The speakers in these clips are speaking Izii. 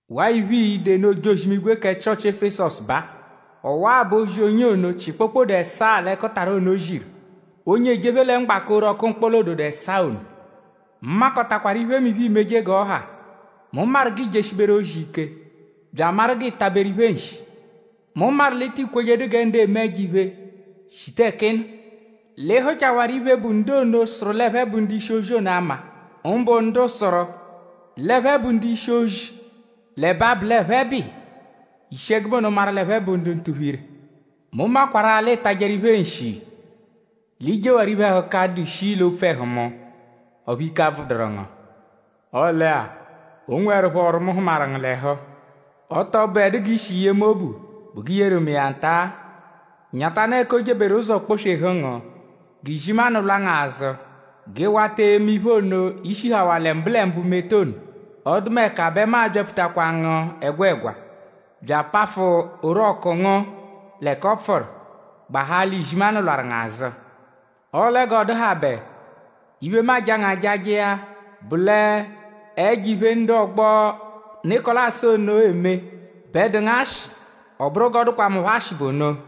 “Waa iphe, ii-de nụ ojozi-imigwe kẹ Chịochi Efesọsu baa: Ọwa-a bụ ozi, onye ono, chị kpokpode ẹsaa l'ẹkutara ono ziru; onye ejephe lẹ mgbaka orọku mkpọla-ododo ẹsaa ono. Mu makọtakwaru iphemiphe, iimeje g'ọ ha; mu maru g'iijeshiberu ozi ike; bya amaru g'ịi taberu iphe nshi. Mu maru l'ị tị kwejedu gẹ ndu eme ẹjo-iphe shita ẹka ị nọ. L'ị hụchawaru iphe, bụ ndu ono, sụru l'ẹphe bụ ndu-ishi-ozi ono ama; mbụ ndu sụru l'ẹphe bụ ndu-ishi-ozi; l'ẹbe abụ l'ẹphe bụ iya; i shi ẹgube ono maru l'ẹphe bụ ndu ntuphu-ire. Mu makwarụ-a l'ị tajẹru iphe nshi; l'ị jewaru iphe-ẹhuka, dụ shii l'opfu ẹhu mu; ọphu ike abvụduru ngu; ọle-a; o nweẹrupho ọru, mu hụmaru ngu l'ẹhu. Ọ tọ bụedu g'i shi yee mu obu bụ g'i yeru mu iya nta-a. Nyatanụ ẹka o jeberu ụzo kpọ-swehu ngu. G'izimanụ lwa ngu azụ; g'ị wata eme iphe ono, i shihawaa lẹ mbụlembu meta ono; ọdumeka bẹ mu a-byapfutakwa ngu ẹgwegwa; bya apafụ orọku ngu l'ẹka ọ pfụru; gbahaa l'izimanụ lwarụ ngu azụ. Ọle g'ọ dụhabe; iphe, mu aja ngu ajaja iya bụ l'ẹjo-iphe ndu ọgbo Nịkolasu ono eme bẹ dụ ngu ashị; ọ bụru g'ọ dụkwa mu phọ ashị bụ ono.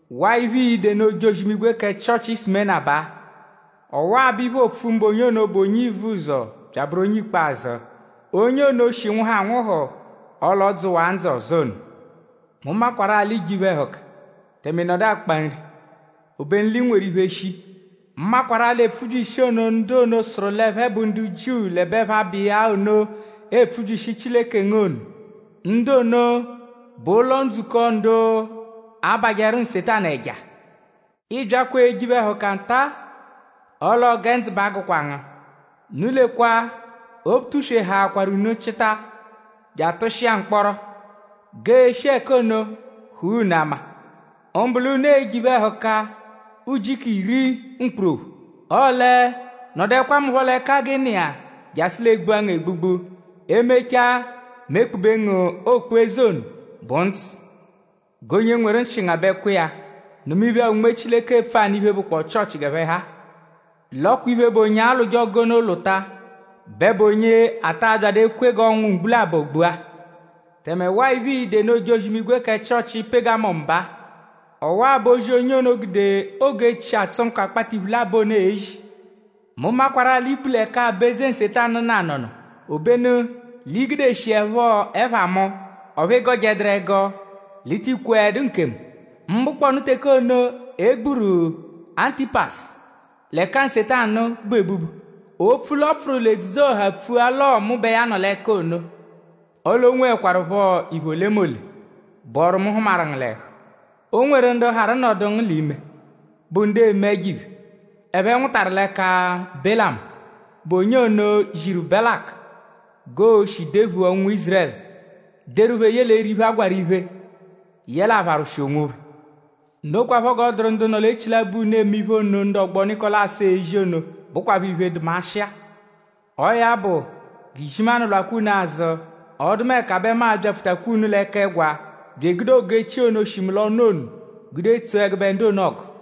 “Waa iphe, ii-de nụ ojozi-imigwe kẹ Chịochi Sumena baa: “Ọwa-a bụ iphe, oopfu mbụ onye ono, bụ onye ivuzọ bya abụru onye ikpazụ; onye ono, shi nwụhu anwụhu; ọle ọ dzụwaa ndzụ ọzo ono. Mu makwarụ-a l'iije iphe-ẹhuka; tẹme ị nọdu akpa nri; obenu l'i nweru iphe shii. Mu makwarụ-a epfubyishi ono, ndu ono, sụru l'ẹphe bụ ndu Jiu l'ẹbe ẹphe abụ iya ono epfubyishi Chileke ngu ono; ndu ono bụ ụlo-ndzukọ ndu abajẹru Nsetanu ẹja. Ii byakwa eje iphe-ẹhuka nta-a; ọle ọo gẹ ndzụ ba agụkwa ngu. Unu lekwa; Obutuswe a-hakwaru unu chịta je atụshia mkpọro; g'e shi ẹka ono hụa unu ama. Mbụ l'unu e-je iphe-ẹhuka ujiku iri mkpurophu. Ọle; nọduekwa mu phọ l'ẹka g'ị nọ iya jasụ l'egbua ngu egbugbu; e-mechaa mu ekpube ngu okpu-eze ono, bụ ndzụ. “G'onye nweru nchị ngabẹkwa iya; nụma iphe-a, Unme Chileke epfu anụ iphe, bụkpoo Chịochi g'ẹphe ha-a. “L'ọ kwa iphe, bụ onye alwụje ọgu ono lwụta bẹ bụ onye a ta abyadụ ekwe g'ọnwu mgbu labọ gbua.” Tẹme waa iphe, ii-de nụ ojozi-imigwe kẹ Chịochi Pegamọmu baa: “Ọwa-a bụ ozi, onye ono, gude ogu-echi, atsụ nkọ akpata iphu labọ ono ezi. Mu makwarụ-a l'i bu l'ẹka aba-eze Nsetanu nọ anọno. Obenu l'i gudeshiẹpho ẹpha mu; ọphu ị gọjeduru ẹgo l'i ti kweẹdu nkemu; mbụkponu teke ono e gburu Antipasu l'ẹka Nsetanu bu ebubu; opfu l'ọo l'ọ pfụru l'edzudzu-ọha pfua l'ọo mu bẹ ya nọ l'ẹka ono. Ọle o nweẹkwarupho iphe olemole, bụ ọru, mu hụmaru ngu l'ẹhu. O nweru ndu harụ nọdu ngu l'ime, bụ ndu eme ẹjo-iphe, ẹphe nwụtaru l'ẹka Belamu, bụ onye ono ziru Belaku g'o-shi dephua ụnwu Ízurẹlu; deru phẹ ye l'eri iphe, a gwarụ iphe; yẹle apharwụshi onwophẹ. Nokwaphọ g'ọ dụru ndu nọ l'echilabọ unu; eme iphe ono, ndu ọgbo Nịkolasu ezi ono, bụkwapho iphe, dụ mu ashị-a. Ọo ya bụ; g'izimanụ lwakwa unu azụ; ọdumeka bẹ mu a-byapfutakwa unu l'ẹka-ẹgwa bya egude ogu-echi ono, shi mu l'ọnu ono gude tsoo ẹgube ndu ono ọgu.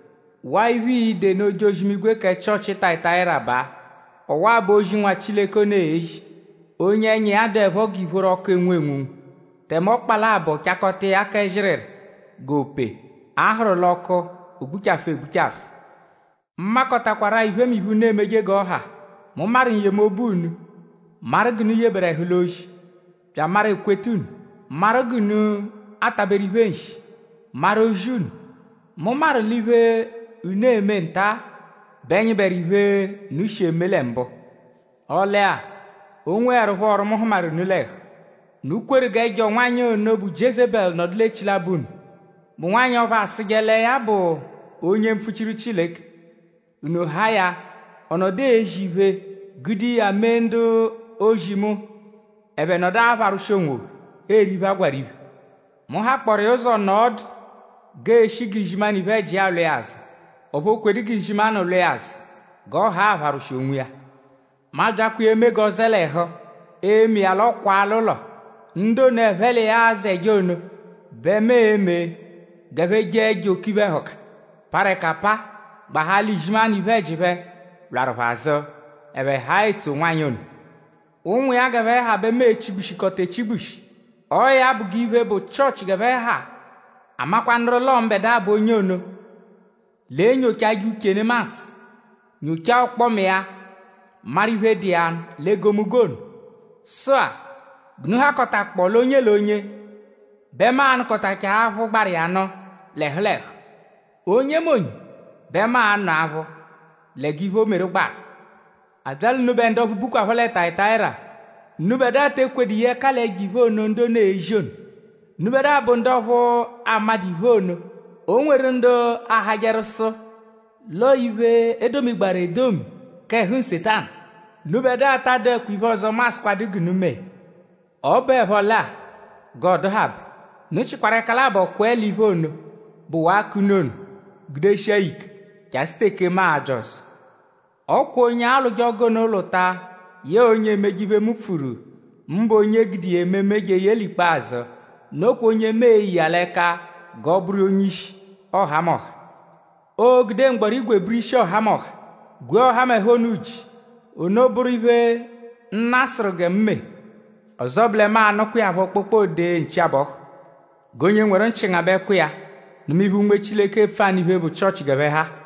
“Waa iphe, ii-de nụ ojozi-imigwe kẹ Chịochi Tayatayira baa: ‘Ọwa-a bụ ozi, Nwa Chileke ono ezi; onye ẹnya iya dụepho g'ìphóró ọku, enwu enwunwu; tẹme ọkpa labọ chakọta iya kẹ zịriri g'ope, a hụru l'ọku o gbuchafụ egbuchafụ. Mu makọtakwaru-a iphemiphe, unu emeje g'ọ ha. Mu maru n-yemobu unu; maru g'unu yeberu ẹhu l'ozi bya amaru ekweta unu; maru g'unu ataberu iphe nshi; maru ozi unu. Mu maru l'iphe, unu eme nta-a bẹ nyịberu iphe, unu shi eme lẹ mbụ. Ọle-a; o nweẹrupho ọru, mu hụmaru unu l'ẹhu: Unu kweru g'ẹjo nwanyị ono, bụ Jiezebẹlu nọdu l'echilabọ unu, bụ nwanyị ọphu asụje lẹ ya bụ onye-mpfuchiru Chileke; unu haa ya ọ nọdu ezi iphe; gude iya mee ndu-ozi mu ẹphe nọdu apharwụshi onwophẹ; eri iphe, a gwarụ iphe. Mu hakpọoru iya ụzo nọo ọdu g'ee-shi g'izimanụ iphe-ẹji iya lwa iya azụ; ọphu o kwedu g'izimanụ lwa iya azụ g'ọ haa apharwụshi onwiya. Mu abyakwa iya eme g'ọ zẹe l'ẹhu, e-mee iya l'ọ kwaa l'ụlo. Ndu ono, ẹphe l'iya azẹje ono bẹ mu e-me g'ẹphe jee ẹjo oke iphe-ẹhuka, parụ ẹka apaa; gbahaa l'izimanụ iphe-ẹji phẹ lwarụ phẹ azụ; ẹphe haa etso nwanyị ono. Ụnwu iya g'ẹphe ha bẹ mu e-chigbushikọta echigbushi. Ọo ya bụ g'iphe, bụ Chịochi g'ẹphe ha amakwanụru l'ọo mbẹdua bụ onye ono, l'enyochajẹ uche nemadzụ; nyochaa ọkpoma iya maru iphe dụ iya l'egomunggo ono. Sụ-a; g'unu hakọtakpoo l'onye l'onye bẹ mu a-nụkotachaa aphụ gbaru iya nụ l'ẹhu l'ẹhu. Onyemonye bẹ mu a-nụ aphụ lẹ g'iphe, o meru gbaru. “ ‘A bya l'unubẹ ndu ọphu bukwaphọ lẹ Tayatayira; unubẹdua te ekwedu ye ẹka l'ẹjo-iphe ono, ndu ono ezi ono. Unubẹdua bụ ndu ọphu amadụ iphe ono, o nweru ndu ahajẹru sụ l'ọo iphe, e domigbaru edomi k'ẹhu Nsetanu. Unubẹdua ta adụekwa iphe ọzo, mu asụkwadu g'unu mee. Ọ bụepho lẹ-a; g'ọ dụhabe; unu chịkwaru ẹka labọ kwẹe l'iphe ono, bụwaa k'unu ono gudeshia ya ike jasụ teke mu a-bya ọzo. Ọ kwa onye alwụje ọgu ono lwụta yẹe onye emeje iphe, mu pfuru; mbụ onye gude iya ememe jeye l'ikpazụ; nokwa onye mu e-ye iya l'ẹka g'ọ bụru onye-ishi ọhamoha. Oo-gude mgbọrígwè bụru ishi ọhamoha; gwee ọhamoha ono uji. Ono bụru iphe, Nna sụru gẹ mu mee. Ọzo bụ lẹ mu a-nụkwa iya phọ kpokpode nchi-abọhu. “ ‘G'onye nweru nchị ngabẹkwa iya; nụma iphe-a, Unme Chileke epfu anụ iphe, bụ Chịochi g'ẹphe ha-a.’”